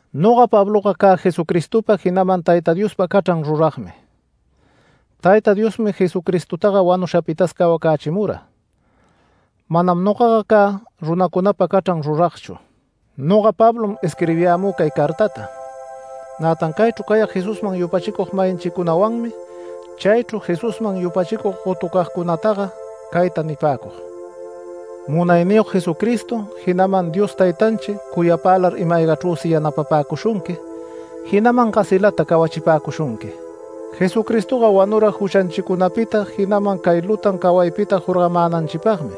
Noga Pabloga cä Jesucristopa, jinaman Tayta Diospa cachran ruragmi. Tayta Diosmi Jesucristotaga wanushapitas cawacächimura. Manam nogaga cä runacunapa cachran ruragchu. Noga Pablom, isquirbiyämü cay cartata. Nätan caychru cayag Jesusman yupachicug-mayinchicunawanmi chaychru Jesusman yupachicug gotucagcunataga cayta nipäcug: Munayniyog Jesucristo, jinaman Dios Taytanchi cuyapälar ima-aygachrüsi yanapapäcushunqui, jinaman gasilata cawachipäcushunqui. Jesucristoga wanura juchanchicunapita, jinaman cay lutan cawaypita jorgamänanchipagmi,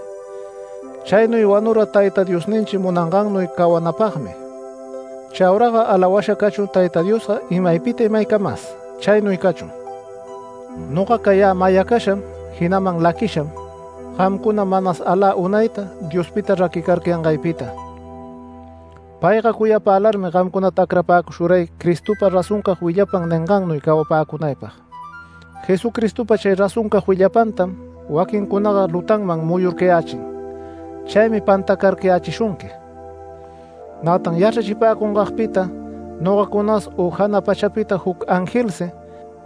chaynuy wanura Tayta Diosninchi munangannuy cawanapagmi. Chauraga alawasha cachun Tayta Diosga imaypita imaycamas. Chaynuy cachun. Noga cayä mayacasham, jinaman laquisham gamcuna manas alä unayta Diospita raquicarcayangaypita. Payga cuyapälarmi gamcunata acrapäcushuray Cristopa razoncag willapan ningannuy cawapäcunaypag. Jesucristopa chay razoncag willapantam waquincunaga lutanman muyurcayächin, chaymi pantacarcayächishunqui. Nätan yachrachipäcungagpita, nogacunas u jana pachapita juc angelsi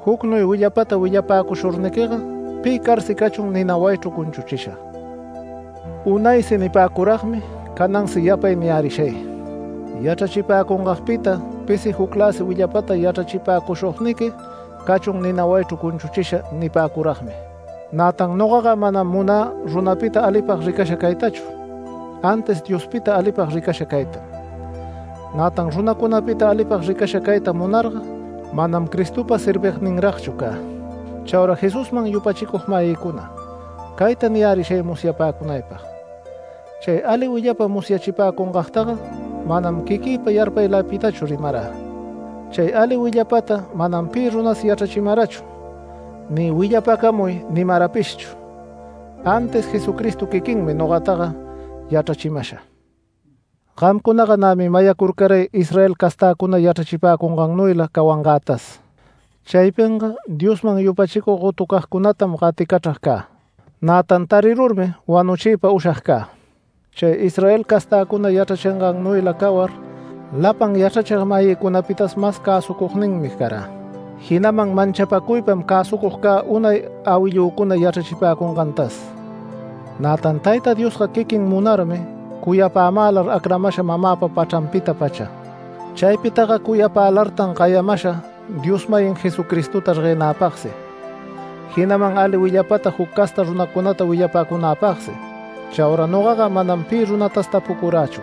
jucnuy willapata willapäcushurniquiga pi carsi cachun nina wayichru cunchuchisha. Unaysi nipäcuragmi, canansi yapay niyärishay: Yachrachipäcungagpita pisi jucläsi willapata yachrachipäcushugniqui cachun nina wayichru cunchuchisha nipäcuragmi. Nätan nogaga manam munä runapita alipag ricasha caytachu, antis Diospita alipag ricasha caytam. Nätan runacunapita alipag ricasha cayta munarga manam Cristopa servigninragchu cä. Chaura Jesusman yupachicug-mayïcuna cayta niyärishay musyapäcunaypag: Chay ali willapa musyachipäcungagtaga manam quiquïpa yarpayläpitachu rimarä. Chay ali willapata manam pi runas yachrachimarachu ni “Willapacamuy” nimarapishchu, antis Jesucristo quiquinmi nogataga yachrachimasha. Gamcunaga nämi mayacurcaray Israel castäcuna yachrachipäcungannuyla cawangätas. Chaypinga Diosman yupachicug gotucagcunatam gaticachrag cä, nätan tarirurmi wanuchiypa ushag cä. Chay Israel castäcuna yachrachingannuyla cawar lapan yachrachig-mayïcunapitas mas cäsucugninmi carä, jinaman manchapacuypam cäsucug cä unay awillücuna yachrachipäcungantas. Nätan Tayta Diosga quiquin munarmi cuyapämälar acramasha mamäpa pachranpita-pacha. Chaypitaga cuyapälartan gayamasha Dios-mayin Jesucristota reguenäpagsi, jinaman ali willapata juc casta runacunata willapacunäpagsi. Chaura nogaga manam pi runatas tapucurächu.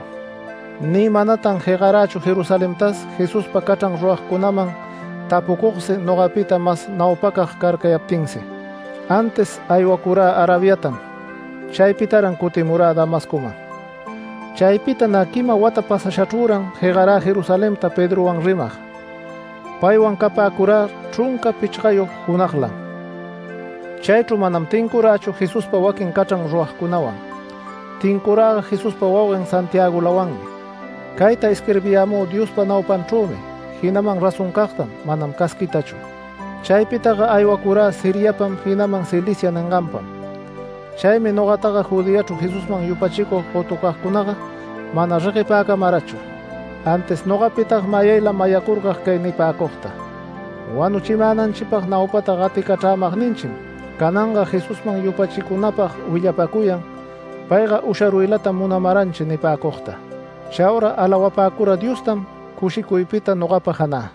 Ni manatan jegarächu Jerusalentas Jesuspa cachran ruragcunaman tapucugsi nogapita mas naupacag carcayaptinsi, antis aywacurä Arabiatam. Chaypitaran cutimurä Damascoman. Chaypita nä quima wata pasashachrüran jegarä Jerusalenta Pedrowan rimag. Paywan capäcurä chrunca pichgayog junaglam. Chaychru manam tincurächu Jesuspa waquin cachran ruragcunawan. Tincuräga Jesuspa wauguen Santiagolawanmi. Cayta isquirbiyämü Diospa naupanchrümi jinaman razoncagtam, manam casquitachu. Chaypitaga aywacurä Siriapam jinaman Cilicia ninganpam. Chaymi nogataga Judeachru Jesusman yupachicug gotucagcunaga mana reguepäcamarachu. Antis nogapitaga mayaylam mayacurcag cay nipäcugta: “Wanuchimänanchipag naupata gaticachrämagninchim cananga Jesusman yupachicunapag willapacuyan, payga usharuylatam munamaranchi” nipäcugta. Chaura alawapäcura Diostam cushicuypita nogapa janä.